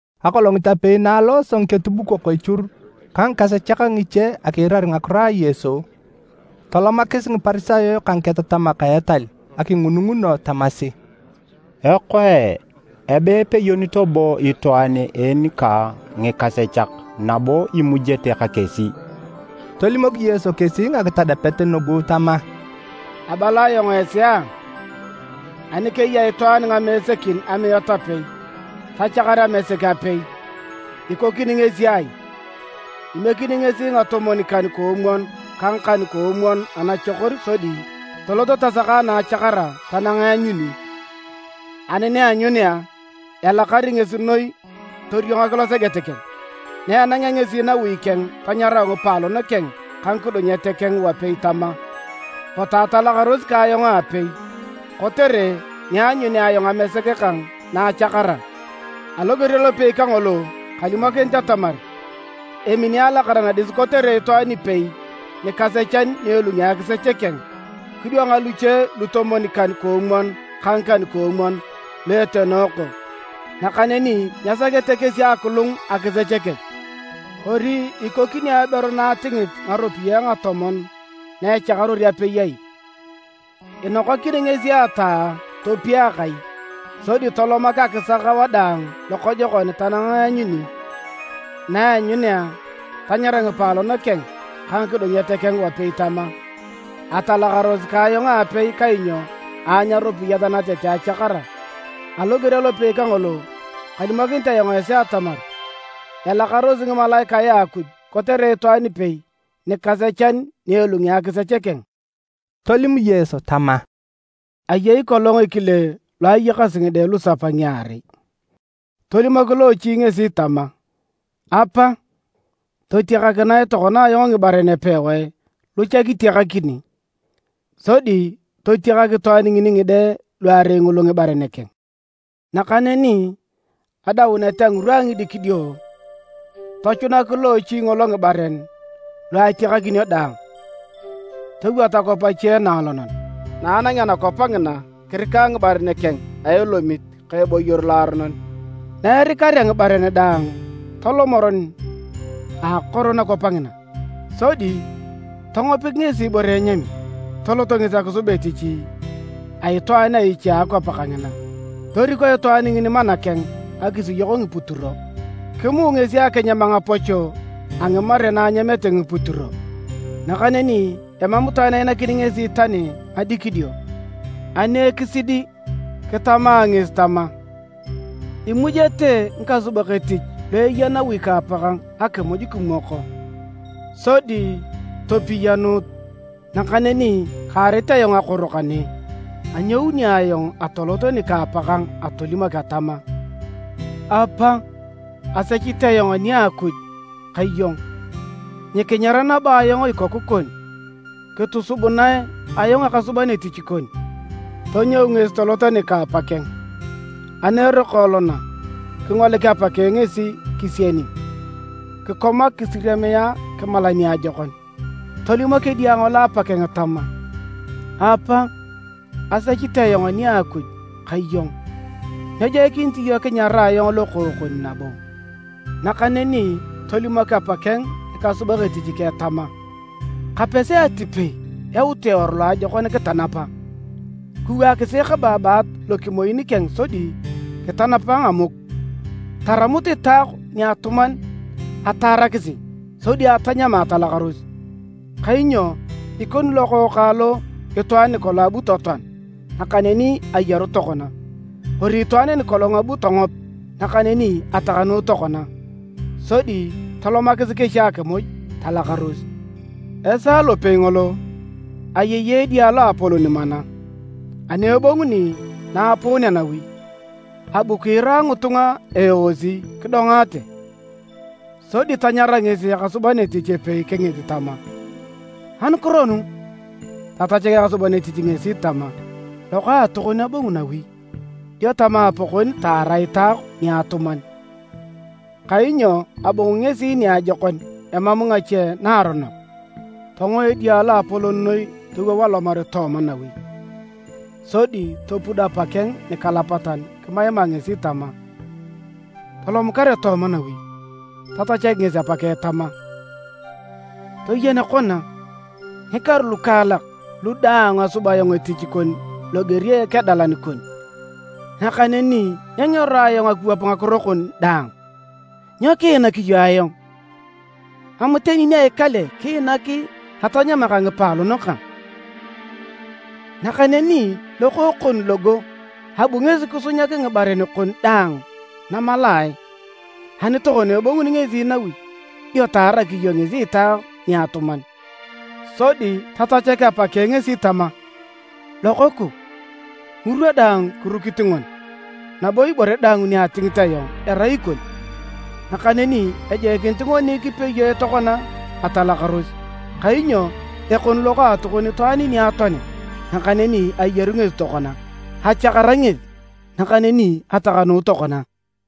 Akolongit apei na alooso ngiketubukok echur ka ngikasechak ngiche akiirar ngakiro a Yesu, tolomakis Ngiparisayo ka ngiketatamak a etal akingununguno tamasi, “Ekoe! Abe epeyonito bo itwaan en ka ngikasechak nabo imujete ka kesi!” Tolimok Yesu kesi ngakitadapet nugu tama: “Abala ayong esi a! Ani keya itwaan ngamesekin amiat apei, tachakar amesek apei, ikokini ngesi ai? Imiekini ngesi ngatomwon-kan-koomwon ka ngakan-koomwon anachokor sodi tolot tasaka na achakara tanang eanyuni. Ani na aanyunea, elakar ngesi noi toriongak loseget keng. Na enangea ngesi nawi keng tanyarau ngipaalon keng ka ngikudunyet keng wapei tama, ‘Potu atalakaros ka ayong aapei, kotere ni aanyunea ayong amesek kang na achakara!’ Aloger alopei kangolo, kalimokinit atamar emini alakara nadis kotere itwaan ipei nikasechan ni elungi akisech keng, kidwang luche lutomwon-kan-koomwon ka ngikan-koomwon lu etenooko, nakaneni nyesakete kesi akilung akisech kech. “Kori ikokini aberu na atingit ngaropiyae ngatomon na echakaror apei ai? Inokakini ngesi ataa topia akai, sodi tolomak akisak wadaang lokojokon tanang eanyuni. Na aanyunea, tanyara ngipaalon keng ka ngikudunyet keng wapei tama, ‘Atalakaros ka ayong aapei kainyo aanyu aropiyat natete achakara!’ Aloger alopei kangolo, kalimokinit ayong esi atamar, elakarosi ngimalaikae a Akuj kotere itwaan ipei nikasechan ni elungi akisech keng.” Tolim Yesu tama, “Ayei kolong ekile lo ayakasi ngide lusapa ngiarei. Tolimok loochi ngesi tama, ‘Apa, totiakakinae tokona ayong ngibaren epewae lu cha kitiakakini.’ Sodi totiakak itwaan ngini ngide luarei ngulu ngibaren keng. Nakaneni adaunet a ngirwa a ngidikidio, tochunak loochi ngolo ngibaren lu atiakakinio daang, towot akwap ache naalonon, na anangea nakwap ngina kirika ngibaren keng a elomit ka eboyor loaronon. Na erikarea ngibaren daang, tolom eron a akoro nakwap ngina, sodi tongopik ngesi ibore enyami, tolot ngesi akisub etich a itwaan a iche a akwap kangina, toriko itwaan ngini mana keng akisiyok ngiputiro. Kimuu ngesi akinyam ngapocho a ngimare na anyamete ngiputiro nakaneni emam itwaan ainakini ngesi tani ngadikidio. Ani ekisidi kitama ngesi tama, ‘Imujete ngikasubak etich lu eya nawi ka apakang akimuj kimwoko, sodi topiyanut, nakaneni kaarit ayong akoro kane! Anyouni ayong atolot nika apakang atolimok atama: “Apa, asechit ayong ani a Akuj ka iyong. Nyikinyar nabo ayong ikoku kon, kitosubunae ayong ekasuban etich kon.”’ Tonyou ngesi tolot nika a apakeng. “Ani eroko elona, kingolik apakeng ngesi, kisieni, kikomak kisiriamia kimala niajokon. Tolimok edia ngolo apakeng tama, ‘Apa, asechit ayong ani a Akuj ka iyong, nyejoikinit iyong kinyarae ayong lokookon nabo.’ Nakaneni tolimok apakeng ngikasubak etich keng tama, ‘Kapesi atipei yautu eworu loajokon kitanapa. Kiwaakisi ekababaat lokimoin keng sodi kitanapa ngamuk. Taramut itaok niatuman ataarakisi, sodi atanyama atalakaros! Kainyo ikoni lokookang lo itwaan nikolong abu totoan, nakaneni ayaru tokona, kori itwaan nikolong abu tongop, nakaneni atakanuu tokona.’ Sodi tolomakis kesi akimuj talakaros. “Esaa lopei ngolo, ayei edia loapolon mana. Ani ebonguni na aapuunea nawi, abu kiira ngitunga eeosi kidongaate. Sodi tanyara ngesi ekasuban etich epei kingit tama, ‘Anukiro nu?’ Tatachak ekasuban etich ngesi tama, ‘Lokaatokon abongu nawi, dio tama apakon taara itaok niatuman, kainyo abongu ngesi niajokon emam ngache naaronok.’ Tongo edia loapolon noi towou alomar tooma nawi, sodi topud apakeng nikalapatan kimaima ngesi tama, ‘Tolom kare tooma nawi.’ Tatachak ngesi apakeng tama, ‘Toyen kona, ngikaru lukaalak lu daang asub ayong etich kon loger a ekedalan kon, nakaneni nyengero ayong akiwap ngakiro kon daang. Nyo kiinak iyong ayong? Mam tani nia ikale kiinak atanyama ka ngipaalon kang! Nakaneni lokookon logo abu ngesi kisunyak ngibaren kon daang namalae, ani tokona ebonguni ngesi nawi, dio taarak iyong ngesi itaok niatuman!’ Sodi tatachak apakeng ngesi tama, ‘Lokooku, ngirwa daang kirukit ngoni, nabo ibore daang ni atingit ayong erai ikon. Nakaneni ejoikinit ngoni kipeyoe tokona atalakaros, kainyo ekoni lokaatokon itwaan niatoanit, nakaneni ayaru ngesi tokona, achakara ngesi, nakaneni atakanuu tokona.’”